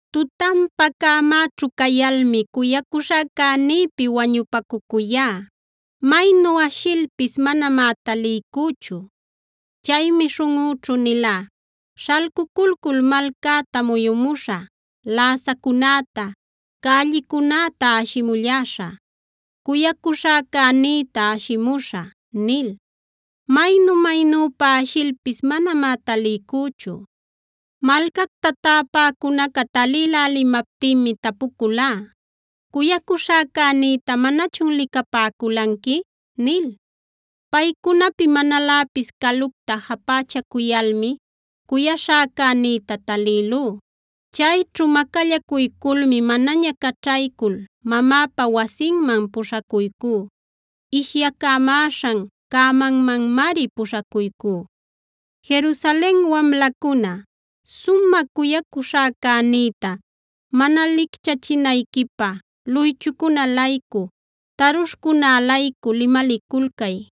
Tutanpa cämäćhu cayalmi cuyacuśhäcänïpi wañupacucuyá; maynu ashilpis manamá taliycüchu. Chaymi śhunꞌüćhu nilá: “Śhalcuculcul malcäta muyumuśhä. Läsacunäta, cällicunäta ashimulläśhä; cuyacuśhäcänïta ashimuśhä” nil. Maynu-maynüpa ashilpis manamá taliycüchu. Malcacta täpäcunaca talïlälimaptinmi tapuculá: “¿Cuyacuśhäcänïta manachun licapäculanqui?” nil. Paycunapi manaläpis calucta japächacuyalmi cuyaśhäcänïta talïlú. Chayćhu macallacuyculmi manaña caćhaycul mamäpa wasinman puśhacuycú; ishyacamäśhan cämanmanmari puśhacuycú. Jerusalen wamlacuna, sumä cuyacuśhäcänïta mana licchachinayquipä luychucunä-laycu, tarushcunä-laycu limaliculcay.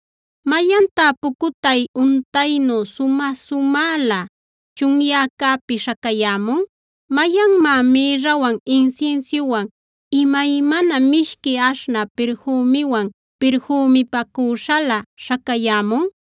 ¿Mayantá pucutay untaynu sumä-sumälä chunyäcäpi śhacayämun? ¿Mayanmá mïrrawan, insinsiuwan, imaymana mishqui aśhnä pirfümiwan pirfümipacüśhalä śhacayämun?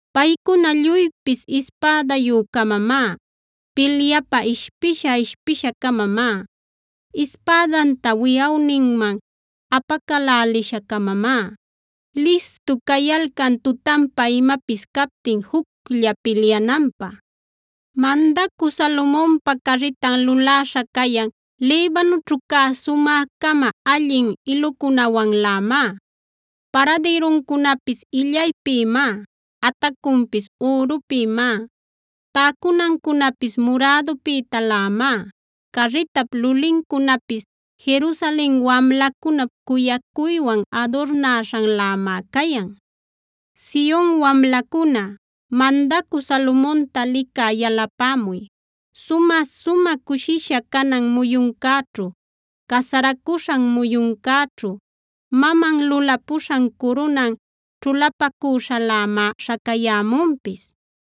Paycuna lluypis ispädayü-camamá, pilyapä ishpisha-ishpisha-camamá. Ispädanta wiyawninman apacälälisha-camamá listu cayalcan tutanpa imapis captin juclla pilyananpä. Mandacü Salomonpa carritan luläśha cayan Libanoćhu cä sumä-cama allin ilucunawanlämá. Paradïruncunapis illaypïmá; atacunpis ürupïmá, täcunancunapis murädupïtalämá. Carritap lulincunapis Jerusalen wamlacunap cuyacuywan adurnäśhanlämá cayan. ¡Sion wamlacuna, mandacü Salomonta licä yalapämuy! Sumä-sumä cushisha canan muyuncäćhu, casaracuśhan muyuncäćhu maman lulapuśhan curunan ćhulapacüśhalämá śhacayämunpis.